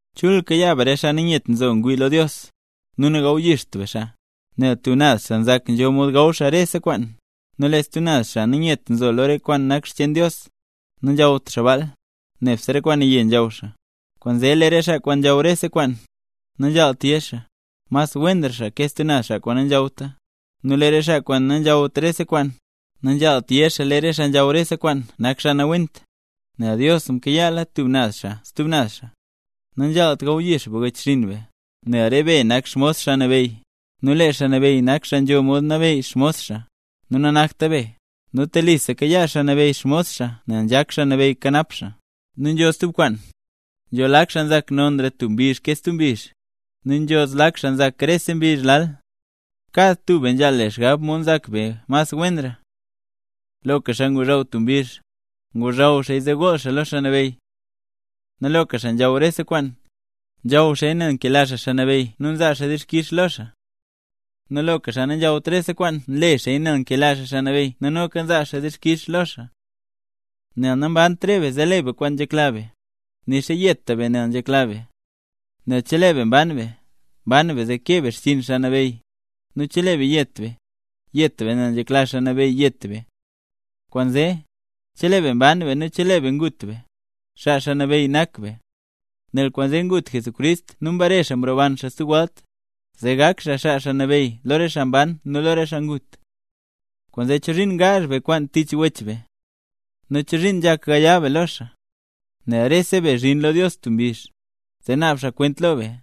Chul kayaa be re xaa nanyet nzo ngwii lo Dios, nu nagawyixt be xaa. Nel tub naz xaa nzak nzho mod gaw xaa rese kwaan, nu lee stub naz xaa nanyet nzo lo re kwaan nak xcheen Dios, nanzhawt xaa baal, nebse re kwaan naye nzhaw xaa. Kwaanzee lee re xaa kwaan nzhaw rese kwaan, nanzhaalt yé xaa, mas wenra xaa ke stub naz xaa nanzhawta. Nu lee re xaa kwaan nanzhawt rese kwaan, nanzhaalt yé xaa lee re xaa nzhaw rese kwaan nak xaa nawent, nel Dios mkayaala tub naz xaa stub naz xaa. Nanzhaalt gawyix be wechxinn be, nel re be nak xmos Xaa Nabeyy, nu lee Xaa Nabeyy nak xaa nzho mod nabeyy xmos xaa, nu nanakta be. Nu telisa kayaa Xaa Nabeyy xmos xaa nel nzhak Xaa Nabeyy kanap xaa. Nu nzho stub kwaan, nzho lak xaa nzak mas nonra tub mbizh ke stub mbizh, nu nzho zlak xaa nzak rese mbizh lal. Kad tub be nzhaal le xgab mod nzak be mas wenra. Loka xaa ngozhaw tub mbizh, ngozhaw xaaya zee gool xaa lo Xaa Nabeyy. Nu loka xaa nzhaw rese kwaan, nzhaw xaaya nel nkela xaa Xaa Nabeyy nu nzaa xaa dixkix lo xaa. Nu loka xaa nanzhawt rese kwaan nle xaaya nel nkela xaa Xaa Nabeyy nu noka nzaa xaa dixkix lo xaa. Nel nambant re be zee le be kwaan nzhekla be, nixa nayeta be nel nzhekla be. Nel chelee be mban be, mban be zee kee be xchiin Xaa Nabeyy, nu chelee be yet be, yet be nel nzhekla Xaa Nabeyy yet be. Kwaanzee, chelee be mban be nu chelee be ngut be, xaa Xaa Nabeyy nak be. Nel kwaanzee ngut Jesucrist nu mbare xaa mroban xaa stub welt, zee gak xaa Xaa Nabeyy lo re xaa mban nu lo re xaa ngut. Kwaanzee, ¿chozhiin ngaazh be kwaan tich wech be? nu ¿chozhiin nzhak gaya be lo xaa? Nel rese be zhin lo Dios tub mbizh, zee naab xaa kwent lo be.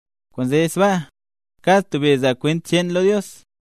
Kwaanzee sbaa, kad tub be zaa kwent cheen lo Dios.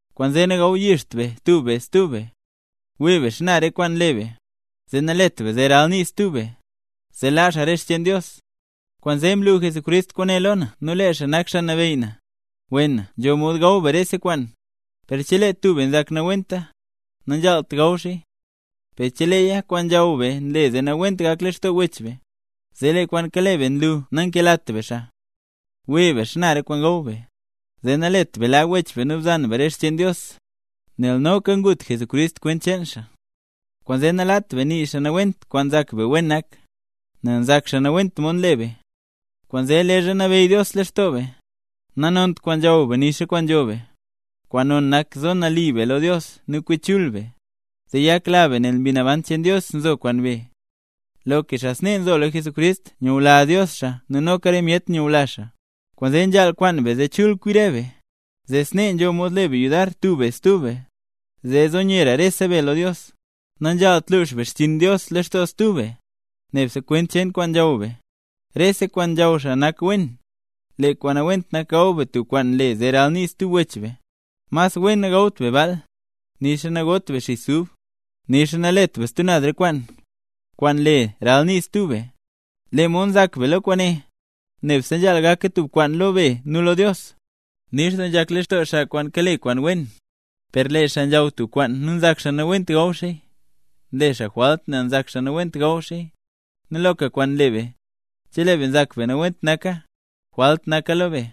Kwaanzee nagawyixt be tub be stub be. Wii be xana re kwaan nle be, zee nalet be zee ralnii stub be, zee laa xaa re xcheen Dios. Kwaanzee mlu Jesucrist kwaane lo na nu lee xaa nak Xaa Nabeyy na; wena nzho mod gaw be rese kwaan, per chelee tub be nzak nawenta, nazhaalt gaw xaaya. Per cheleeya kwaan nzhaw be nle zee nawent gak lextoo wech be, zee lee kwaan kale be nlu nankelat be xaa. Wii be xana re kwaan gaw be, zee nalet be laa wech be nu bzan be re xcheen Dios, nel noka ngut Jesucrist kwent cheen xaa. Kwaanzee nalaat be nii xaa nawent kwaan nzak be wen nak, nel nzak xaa nawent mod nle be. Kwaanzee leezha nabeyy Dios lextoo be, nanont kwaan nzhaw be nixa kwaan nzho be, kwaan non nak zo nali be lo Dios nu kwi chul be, zee yakla be nel lee Mbi Naban cheen Dios nzo kwaan be. Loka xaa snee nzo lo Jesucrist, nyula Dios xaa nu noka re myet nyula xaa. Kwaanzee nzhaal kwaan be zee chul kwi re be; zee snee nzho mod le be yudar tub be stub be, zee zo nyera rese be lo Dios. Nanzhaalt lux be xchiin Dios lextoo stub be, nebse kwent cheen kwaan nzhaw be. Rese kwaan nzhaw xaa nak wen, lee kwaan nawent nak gaw be tub kwaan le zee ralnii stub wech be. Mas wen nagawt be baal, nixa nagot be xis ub, nixa nalet be stub naz re kwaan, kwaan le zee ralnii stub be. Lee mod nzak be lo kwaane, nebse nzhaal gaka tub kwaan lo be nu lo Dios. ¡Nix doo nzhak lextoo xaa kwaan kale kwaan wen! Per lee xaa nzhaw tub kwaan nu nzak xaa nawent gaw xaaya, nle xaa jwalt nel nzak xaa nawent gaw xaaya. Nu loka kwaan nle be, chelee be nzak be nawent naka, jwalt naka lo be.